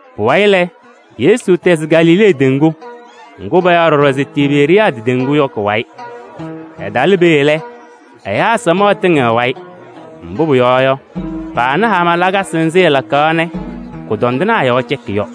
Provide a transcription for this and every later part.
Pʋwayɩ lɛ, Yesu tɛzɩ Galilee teŋgu ŋgʋ payaɣ ɖɔɖɔ se Tiberiyaadɩ teŋgu yɔ kʋ-wayɩ. Ɛtalɩ peeye lɛ, ɛyaa samaɣ tɩŋɩɣ ɛ-wayɩ, mbʋ pʋyɔɔ yɔ, paana hama lakasɩ nzɩ ɛlakaɣ nɛ kʋdɔndɩnaa yɔɔ cɛkɩ yɔ.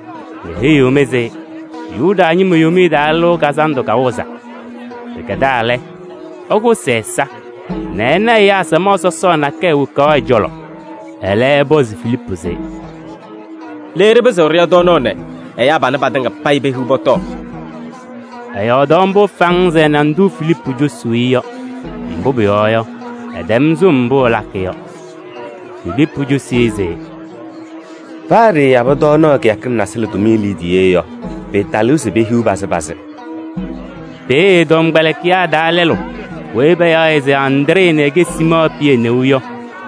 Meheyiɣ-mɩ se Yuda ñɩma Yomiye Taa Lɩʋ Kazandʋ kawɩzaa. Pɩkɛdaa lɛ, ɛkʋsɩ ɛ-ɛza nɛ ɛna ɛyaa samaɣ sɔsɔɔ nakɛyɛ wokaɣ ɛ-cɔlɔ. Ɛlɛ ɛpɔzɩ Filiipu se: “Le ɖɩpɩzɩɣ ɖɩya tɔɔnaɣ nɛ ɛyaa panɛ patɩŋa payɩ pehiɣ pɔtɔɔ?” Ɛyɔɔdaɣ mbʋ faŋŋ se ɛna ndʋ Filiipu cosuu yɔ, mbʋ pʋyɔɔ yɔ, ɛtɛm sɩm mbʋ ɛlakɩ yɔ. Filiipu cosi-i se: “Paa ɖɩɩyabɩ tɔɔnaɣ kɩyakɩŋ nasɩlɛ tʋmɩyɛ liidiye yɔ, pɩɩtalɩɣ se pehiɣ pazɩ pazɩ.” Peeye ɛ-tɔmkpɛlɩkɩyaa taa lɛlʋ weyi payaɣ se Andree nɛ ɛkɛ Siimɔɔ Pɩyɛ neu yɔ,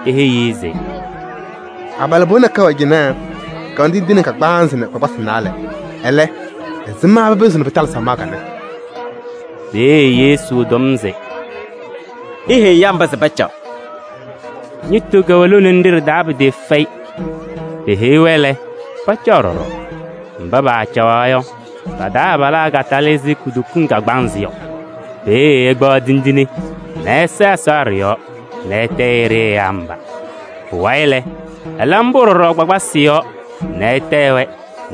eheyi-i se: “Abalɩbɩɣa nakɛyɛ wɛ cɩnɛ, kɛwɛnɩ tindine kagbaanzɩ nɛ kpakpasɩ naalɛ. Ɛlɛ, ɛzɩma pɩpɩzɩɣ pɩtalɩ samaɣ kanɛ?” Peeye Yesu tɔm se: “Iheyi ɛyaa mba se pacaɣ.” Ñɩtʋ kɛwɛ lone nɖɩ ɖɩ-taa pɩtɩɩfɛyɩ. Peheyi-wɛ lɛ, pacaɣ ɖɔɖɔ. Mba paacaɣaɣ yɔ, pa-taa abalaa katalɩ ɛzɩ kutokiŋ kagbaanzɩ yɔ. Peeye ɛkpaɣ tindine nɛ ɛsa Ɛsɔ ɖɩ-yɔɔ nɛ ɛtayɩ-ɖɩ ɛyaa mba. Pʋwayɩ lɛ, ɛla mbʋ ɖɔɖɔ kpakpasɩ yɔɔ nɛ ɛtayɩ-wɛ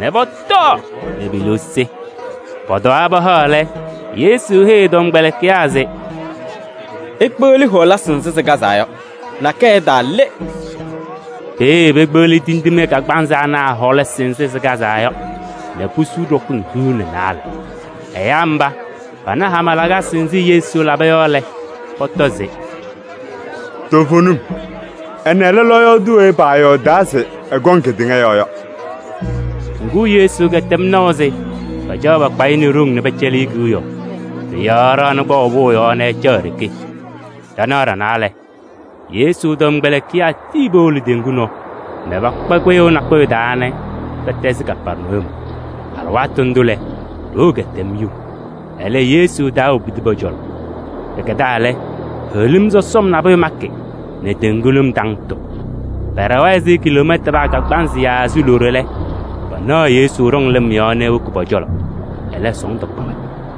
nɛ pɔtɔɔ nɛ pe-liu sɩ. Pɔtɔwaa pahaɣ lɛ, Yesu heyi ɛ-tɔmkpɛlɩkɩyaa se: “Ikpeɣli hɔɔlasɩ nzɩ sɩkazaa yɔ, nakɛyɛ ɛtaale.” Peeye pekpeɣli tindine kagbaanzɩ ana a-hɔɔlasɩ nzɩ sɩkazaa yɔ nɛ pusu ɖɔkɩŋ hiu nɛ naalɛ. Ɛyaa mba, pana hama lakasɩ nzɩ Yesu laba yɔ lɛ, pɔtɔ se: “Toovenim, ɛnɛ lɛ lɔɔyaɣ tʋ weyi paayɔɔdaa se ɛkɔŋ kedeŋa yɔɔ yɔ.” Ŋgʋ, Yesu kɛtɛm naʋ se pacaɣ pakpa-ɩ nɛ ɖoŋ nɛ pɛcɛlɩ-ɩ kewiyaɣ. Pʋ-yɔɔ ɛɖaɣnɩ kpaʋ pʋʋ yɔɔ nɛ ɛcaɣ e-ɖeke. Ɖanaɣ ɖanaa lɛ, Yesu tɔmkpɛlɩkɩyaa tii powolo teŋgu nɔɔ nɛ pakpa kpɩyʋʋ nakʋyʋ taa se pɛtɛzɩɣ Kapɛrnayum. Alɩwaatʋ ndʋ lɛ, ɖoo kɛtɛm yuu, ɛlɛ, Yesu taawobidi pɔ-cɔlɔ. Pɩkɛdaa lɛ, heɣlim sɔsɔm nabʋyʋ makɩ nɛ teŋgu lɩm taŋtɩɣ. Pɛɖɛwa ɛzɩ kiloomɛtanaa kagbaanzɩ yaa loɖo yɔ lɛ, panaɣ Yesu ɖɔŋ lɩm yɔɔ nɛ ewoki pɔ-cɔlɔ, ɛlɛ sɔɔndʋ kpa-wɛ.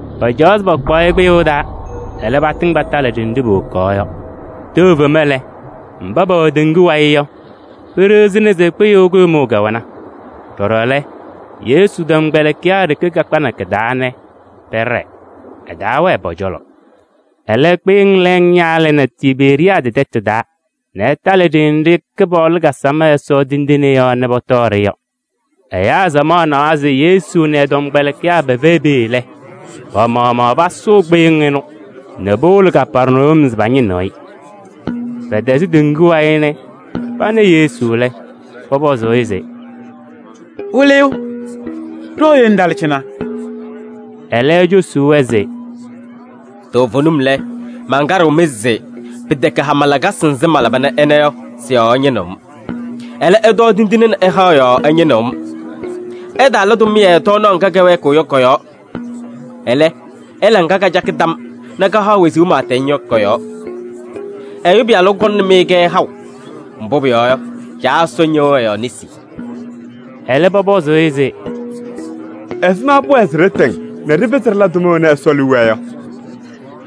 Pacaɣaɣ se pakpaɣ-ɩ kpɩyʋʋ taa, ɛlɛ, patɩŋ patalɩ ɖenɖe powokaɣ yɔ. Tɛʋ fema lɛ, mba pɛwɛ teŋgu wayɩ yɔ, peɖiɣzina se kpɩyʋʋ kʋɖʋmʋʋ kɛwɛna. Ɖɔɖɔ lɛ, Yesu tɔmkpɛlɩkɩyaa ɖeke kakpanɩ kɩ-taa nɛ pɛɖɛɛ, ɛtaawɛɛ pɔ-cɔlɔ. Ɛlɛ, kpɩyɩŋ lɛɛŋ ñaalɩnɩ Tiberiyaadɩ tɛtʋ taa nɛ ɩtalɩ ɖenɖe Kɩpaɣlʋ kasam Ɛsɔ tindine yɔɔ nɛ pɔtɔɔ-ɖɩ yɔ. Ɛyaa samaɣ nawa se Yesu nɛ ɛ-tɔmkpɛlɩkɩyaa pɛfɛyɩ peeye lɛ, pa-maɣmaɣ pasʋʋ kpɩyɩŋ ɩnʋ nɛ powolo Kapɛrnayum se pañɩnɩ-ɩ. Pɛtɛzɩ teŋgu wayɩ nɛ pana Yesu lɛ, pɔpɔzɩ-ɩ se: “Wɩlɩyʋ! Ɖooye ŋtalɩ cɩnɛ?” Ɛlɛ cosi-wɛ se: “Toovenim lɛ, mankaɖɩɣ-mɩ se pɩtɛkɛ hama lakasɩ nzɩ malaba nɛ ɩna yɔ, sɩ-yɔɔ ɩñɩnɩɣ-m. Ɛlɛ, ɩtɔɔ tindine nɛ ɩhaɣ yɔɔ ɩñɩnɩɣ-m. Ɩtaala tʋmɩyɛ tɔɔnaɣ ŋga kɛwɛɛkɩɣ yɔ kɔ-yɔɔ. Ɛlɛ, ɩla ŋga kacakɩ tam nɛ kahaɣ wezuu pɩɩtɛŋ yɔ kɔ-yɔɔ. Ɛyʋ Pɩyalʋ kɔŋnɩ-mɩ-kɛ haʋ, mbʋ pʋyɔɔ yɔ, Caa Ɛsɔ ñɩɣ ɛ-yɔɔ nesi.” Ɛlɛ, pɔpɔzɩ-ɩ se: “Ɛzɩma pʋwɛɛ se ɖɩtɩŋ nɛ ɖɩpɩzɩ ɖɩla tʋma wena Ɛsɔ liu wɛɛ yɔ?”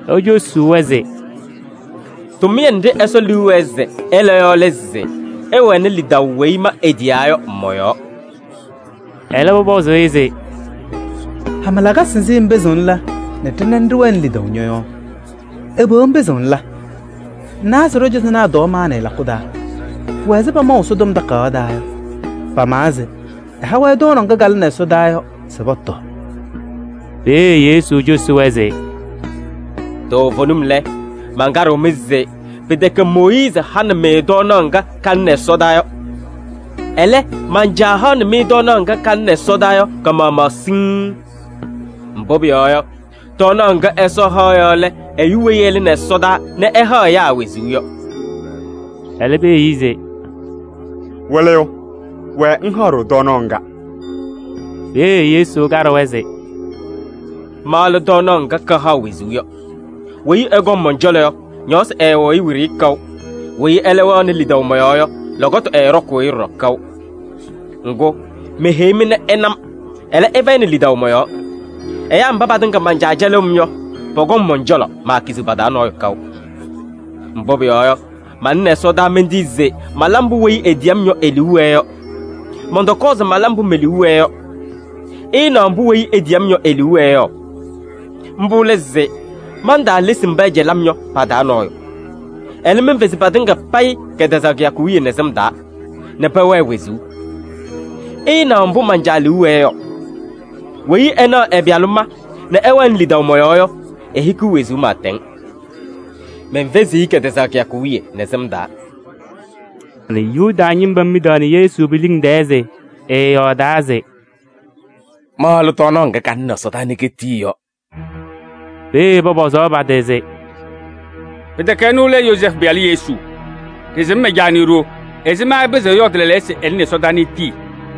Ecosi-wɛ se: “Tʋmɩyɛ nɖɩ Ɛsɔ liu wɛɛ se ɩla yɔ lɛ se ɩwɛnɩ lidaʋ weyi ma etiyaa yɔ mɔ-yɔɔ.” Ɛlɛ pɔpɔzɩ-ɩ se: “Hama lakasɩ nzɩ ŋpɩzɩɣ ŋla nɛ ɖɩna nɛ ɖɩwɛnɩ lidaʋ ñɔ-yɔɔ? Ɛbɛ ŋpɩzɩɣ ŋla? Ŋnawa se ɖɔ-cɔzɔnaa tɔɔ maanɩ lakʋ taa. Pʋwɛ ɛzɩ pamaʋ Ɛsɔtɔm Takayaɣ taa yɔ. Pamawa se: ‘Ɛha-wɛ tɔɔnaɣ ŋga kalɩnɩ ɛsɔdaa yɔ se pɔtɔɔ.’” Peeye Yesu cosi-wɛ se: “Toovenim lɛ, mankaɖɩɣ-mɩ se pɩtɛkɛ Mooyiizi hanɩ-mɩ tɔɔnaɣ ŋga kalɩnɩ ɛsɔdaa yɔ. Ɛlɛ, man-Caa haɣnɩ-mɩ tɔɔnaɣ ŋga kalɩnɩ ɛsɔdaa yɔ ka-maɣmaɣ siŋŋ. Mbʋ pʋyɔɔ yɔ, tɔɔnaɣ ŋga Ɛsɔ haɣ yɔ lɛ ɛyʋ weyi ɛlɩnɩ ɛsɔdaa nɛ ɛhaɣ ɛyaa wezuu yɔ.” Ɛlɛ peheyi-i se: “Wɩlɩyʋ! Wɛɛ ŋhaɣ-ɖʋ tɔɔnaɣ ŋga.” Peeye Yesu kaɖɩ-wɛ se: “Ma lɛ tɔɔnaɣ ŋga kahaɣ wezuu yɔ. Weyi ɛkɔŋ mɔn-cɔlɔ yɔ, ñɔɔsɩ ɛɛwɩɣ-ɩ wiɖiyi kaʋ, weyi ɛlɛ wɛɣnɩ lidaʋ mɔ-yɔɔ yɔ, lɔkɔtʋ ɛɛɖɔkʋʋ-ɩ ɖɔɖɔ kaʋ. Ŋgʋ, meheyi-mɩ nɛ ɩna-m, ɛlɛ, ɩfɛyɩnɩ lidaʋ mɔ-yɔɔ. Ɛyaa mba patɩŋa man-Caa cɛlɩɣ-m yɔ, pɔkɔŋ mɔn-cɔlɔ, maakiziɣ pa-taa nɔɔyʋ kaʋ. Mbʋ pʋyɔɔ yɔ, malɩnɩ ɛsɔdaa mentii se mala mbʋ weyi etiyi-m yɔ e-liu wɛɛ yɔ. Mɔntɔkɔɔ se mala mbʋ me-liu wɛɛ yɔ. Ɩɩnaɣ mbʋ weyi etiyi-m yɔ e-liu wɛɛ yɔ. Mbʋ lɛ se: mantaalesi mba ɛcɛlɩ-m yɔ pa-taa nɔɔyʋ. Ɛlɛ, menfezi patɩŋa payɩ kɛtɛzaɣ kɩyakʋ wiye nɛ sɩm taa nɛ pɛwɛɛ wezuu. Ɩɩnaɣ mbʋ man-Caa liu wɛɛ yɔ: weyi ɛnaɣ ɛ-Pɩyalʋ ma nɛ ɛwɛnɩ lidaʋ mɔ-yɔɔ yɔ, ehikiɣ wezuu pɩɩtɛŋ. Menfeziɣ-i kɛtɛzaɣ kɩyakʋ wiye nɛ sɩm taa.” Yuda ñɩma midaɣnɩ Yesu pe-liŋ tɛɛ se ɛyɔɔdaa se: “Ma lɛ tɔɔnaɣ ŋga kalɩnɩ ɛsɔdaa nɛ ketii yɔ.” Peeye pɔpɔzaɣ pa-tɩ se: “Pɩtɛkɛ ɛnʋ lɛ Yozɛɛfʋ pɩyalʋ Yesu? Ɖɩsɩm ɛ-caa nɛ e-ɖoo, ɛzɩma ɛpɩzɩɣ ɛyɔɔdɩ lɛɛlɛɛyɔ se ɛlɩnɩ ɛsɔdaa nɛ etii” yɔ?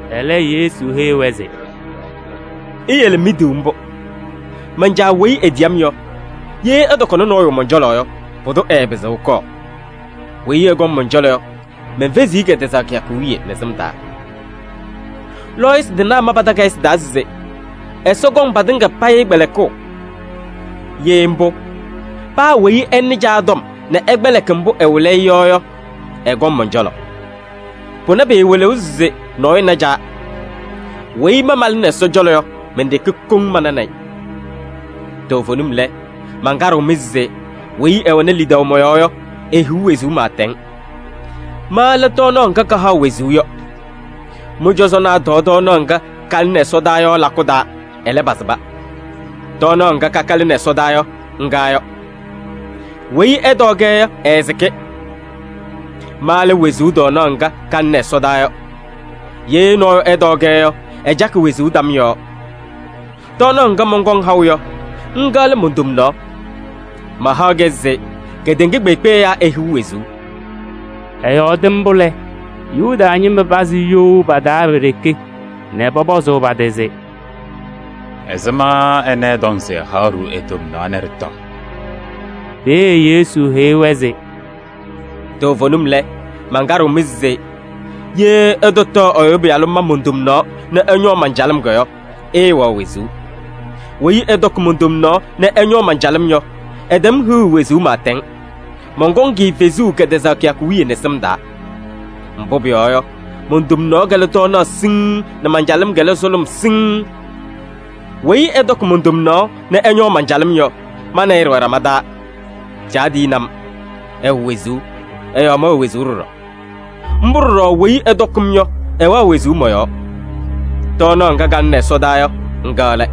Ɛlɛ Yesu heyi-wɛ se: “Iyele miduu mbʋ. Man-Caa weyi etiyi-m yɔ, ye ɛtɔkɔnɩ nɔɔyʋ mɔn-cɔlɔ yɔ, pʋdʋ ɛɛpɩzɩɣ ɛkɔɔ. Weyi ɛkɔŋ mɔn-cɔlɔ yɔ, menfeziɣ-i kɛtɛzaɣ kɩyakʋ wiye nɛ sɩm taa. Lɔɔyɩsɩ tɩnaa ma pa-takayɩsɩ taa se: ‘Ɛsɔ kɔŋ patɩŋa payɩ kpɛlɩkʋʋ.’ Ye mbʋ, paa weyi ɛnɩ Caa tɔm nɛ ɛkpɛlɩkɩ mbʋ ɛwɩlɩ-ɩ yɔ yɔ, ɛkɔŋ mɔn-cɔlɔ. Pʋnɛ pɩɩwɩlɩɣ se nɔɔyʋ na Caa. Weyi ma malɩnɩ Ɛsɔ cɔlɔ yɔ, men-ɖeke koŋ mananɩ-ɩ. Toovenim lɛ, mankaɖɩɣ-mɩ se: weyi ɛwɛnɩ lidaʋ mɔ-yɔɔ yɔ, ehiɣ wezuu pɩɩtɛŋ. Ma lɛ tɔɔnaɣ ŋga kahaɣ wezuu yɔ. Mɩ-cɔzɔnaa tɔɔ tɔɔnaɣ ŋga kalɩnɩ ɛsɔdaa yɔ lakʋ taa, ɛlɛ, pasɩba. Tɔɔnaɣ ŋga kaka lɩnɩ ɛsɔdaa yɔ, ŋga yɔ. Weyi ɛtɔɔ-kɛ yɔ, ɛɛsɩkɩ. Ma lɛ wezuu tɔɔnaɣ ŋga kalɩnɩ ɛsɔdaa yɔ. Ye nɔɔyʋ ɛtɔɔ-kɛ yɔ, ɛcakɩ wezuu tam yɔɔ. Tɔɔnaɣ ŋga mɔnkɔŋ haʋ yɔ, ŋga lɛ mon-tomnaɣ. Mahaɣ-kɛ se kedeŋa kpeekpe ɛyaa ehiɣ wezuu.” Ɛyɔɔdɩ mbʋ lɛ, Yuda ñɩma pazɩ you pa-taa pe-ɖeke nɛ pɔpɔzʋʋ pa-tɩ se: “Ɛzɩma ɛnɛ ɛtɔŋ se ɛhaɣ-ɖʋ e-tomnaɣ nɛ ɖɩtɔɔ?” Peeye Yesu heyi-wɛ se: “Toovenim lɛ, mankaɖɩɣ-mɩ se: ye ɩtɔtɔɔ Ɛyʋ Pɩyalʋ ma mon-tomnaɣ nɛ ɩñɔɔ man-calɩm yɔ, ɩɩwɛɣ wezuu. Weyi ɛtɔkɩ mon-tomnaɣ nɛ ɛñɔɔ man-calɩm yɔ, ɛtɛm hiɣu wezuu pɩɩtɛŋ. Mɔnkɔŋ-ɩ fezuu kɛtɛzaɣ kɩyakʋ wiye nɛ sɩm taa. Mbʋ pʋyɔɔ yɔ, mon-tomnaɣ lɛ tɔɔnaɣ siŋŋ nɛ man-calɩm lɛ sʋlʋm siŋŋ. Weyi ɛtɔkɩ mon-tomnaɣ nɛ ɛñɔɔ man-calɩm yɔ, ma nɛ ɩ ɖɩwɛ ɖama taa. Caa tiyini-m, ɛwɛ wezuu, ɛ-yɔɔ mɛwɛ wezuu ɖɔɖɔ. Mbʋ ɖɔɖɔ weyi ɛtɔkɩ-m yɔ, ɛwɛɣ wezuu mɔ-yɔɔ. Tɔɔnaɣ ŋga kalɩnɩ ɛsɔdaa yɔ, ŋga lɛ.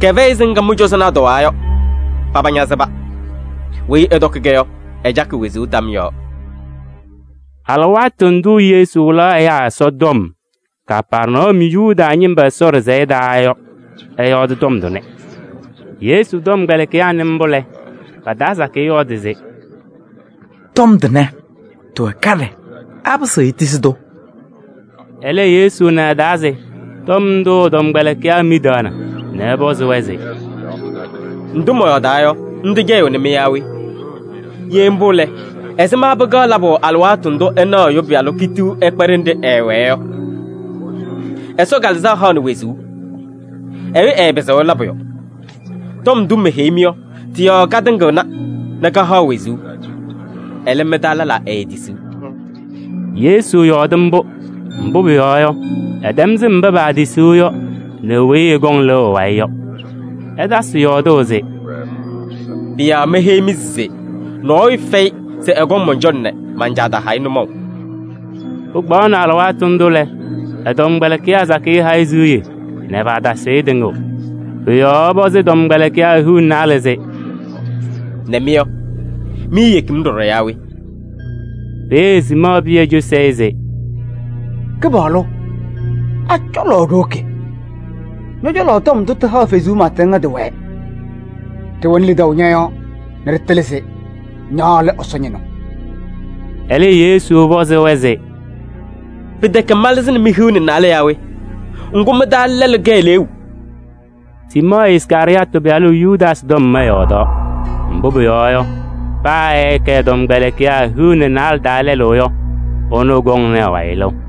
Kɛfɛyɩ ɛzɩ ŋga mɩ-cɔzɔnaa tɔwaa yɔ: paba ñasɩba. Weyi ɛtɔkɩ-kɛ yɔ, ɛcakɩ wezuu tam yɔɔ.” Alɩwaatʋ ndʋ Yesu wɩlaɣ ɛyaa Ɛsɔtɔm Kapɛrnayum Yuda ñɩma Ɛsɔ ɖɩsɛyɛ taa yɔ, ɛyɔɔdɩ tɔm tʋnɛ. Yesu tɔmkpɛlɩkɩyaa nɩ mbʋ lɛ, pa-taa sakɩyɛ yɔɔdɩ se: “Tɔm tʋnɛ, tɩwɛ kaɖɛ. Apɩzɩɣ etisi-tʋ?” Ɛlɛ, Yesu na ɛ-taa se tɔm ndʋ ɛ-tɔmkpɛlɩkɩyaa midiɣna nɛ ɛpɔzɩ-wɛ se: “Ndʋ mɔyɔɔdaa yɔ, ndʋ cɛyɩɣnɩ-mɩ yaa we? Ye mbʋ lɛ, ɛzɩma pɩkaɣ labʋ alɩwaatʋ ndʋ ɩnaɣ Ɛyʋ Pɩyalʋ kitiɣ ɛkpa ɖenɖe ɛɛwɛɛ yɔ? Ɛsɔ Kalɩzaɣ haɣnɩ wezuu. Ɛyʋ ɛɛpɩzɩɣ ɛla pʋyʋ. Tɔm ndʋ meheyi-mɩ yɔ, tɩ-yɔɔ katɩŋɩɣna nɛ kahaɣ wezuu. Ɛlɛ, mɩ-taa lɛlaa eetisiɣ.” Yesu yɔɔdaɣ mbʋ, mbʋ pʋyɔɔ yɔ, ɛtɛm sɩm mba paatisiɣ yɔ nɛ weyi ɛkɔŋ ɛ-wayɩ lɩʋ yɔ. Ɛtasɩ yɔɔdʋʋ se: “Pʋ-yɔɔ meheyi-mɩ se nɔɔyʋ fɛyɩ se ɛkɔŋ mɔn-cɔlɔ nɛ man-Caa taha-ɩ nʋmɔʋ.” Pɩkpaɣnɩ alɩwaatʋ ndʋ lɛ, ɛ-tɔmkpɛlɩkɩyaa sakɩyɛ ha-ɩ siɣye nɛ paatasɩɣ-ɩ tɩŋʋʋ. Pʋ-yɔɔ ɛpɔzɩ ɛ-tɔmkpɛlɩkɩyaa hiu nɛ naalɛ se: “Nɛ mɩ yɔ, miiyeki-m ɖɔɖɔ yaa we?” Peeye Siimɔɔ Pɩyɛ cosi-i se: “Kɩpaɣlʋ! A-cɔlɔ ɖiwoki? Ñɔ-cɔlɔ tɔm ndʋ tɩhaɣ wezuu pɩɩtɛŋ yɔ tɩwɛɛ. Ɖɩwɛnɩ lidaʋ ñɔ-yɔɔ nɛ ɖɩtɩlɩ se ña lɛ Ɛsɔ Ñɩnʋ.” Ɛlɛ Yesu pɔzɩ-wɛ se: “Pɩtɛkɛ malɩzɩnɩ mi-hiu nɛ naalɛ yaa we? Ŋgʋ, mɩ-taa lɛlʋ kɛ eleeu!” Siimɔɔ Iskarɩyɔɔtɩ pɩyalʋ Yudaasɩ tɔm ɛyɔɔdaɣ. Mbʋ pʋyɔɔ yɔ, paa ɛɛkɛ ɛ-tɔmkpɛlɩkɩyaa hiu nɛ naalɛ taa lɛlʋ yɔ, ɛnʋ kɔŋnɩ ɛ-wayɩ lɩʋ.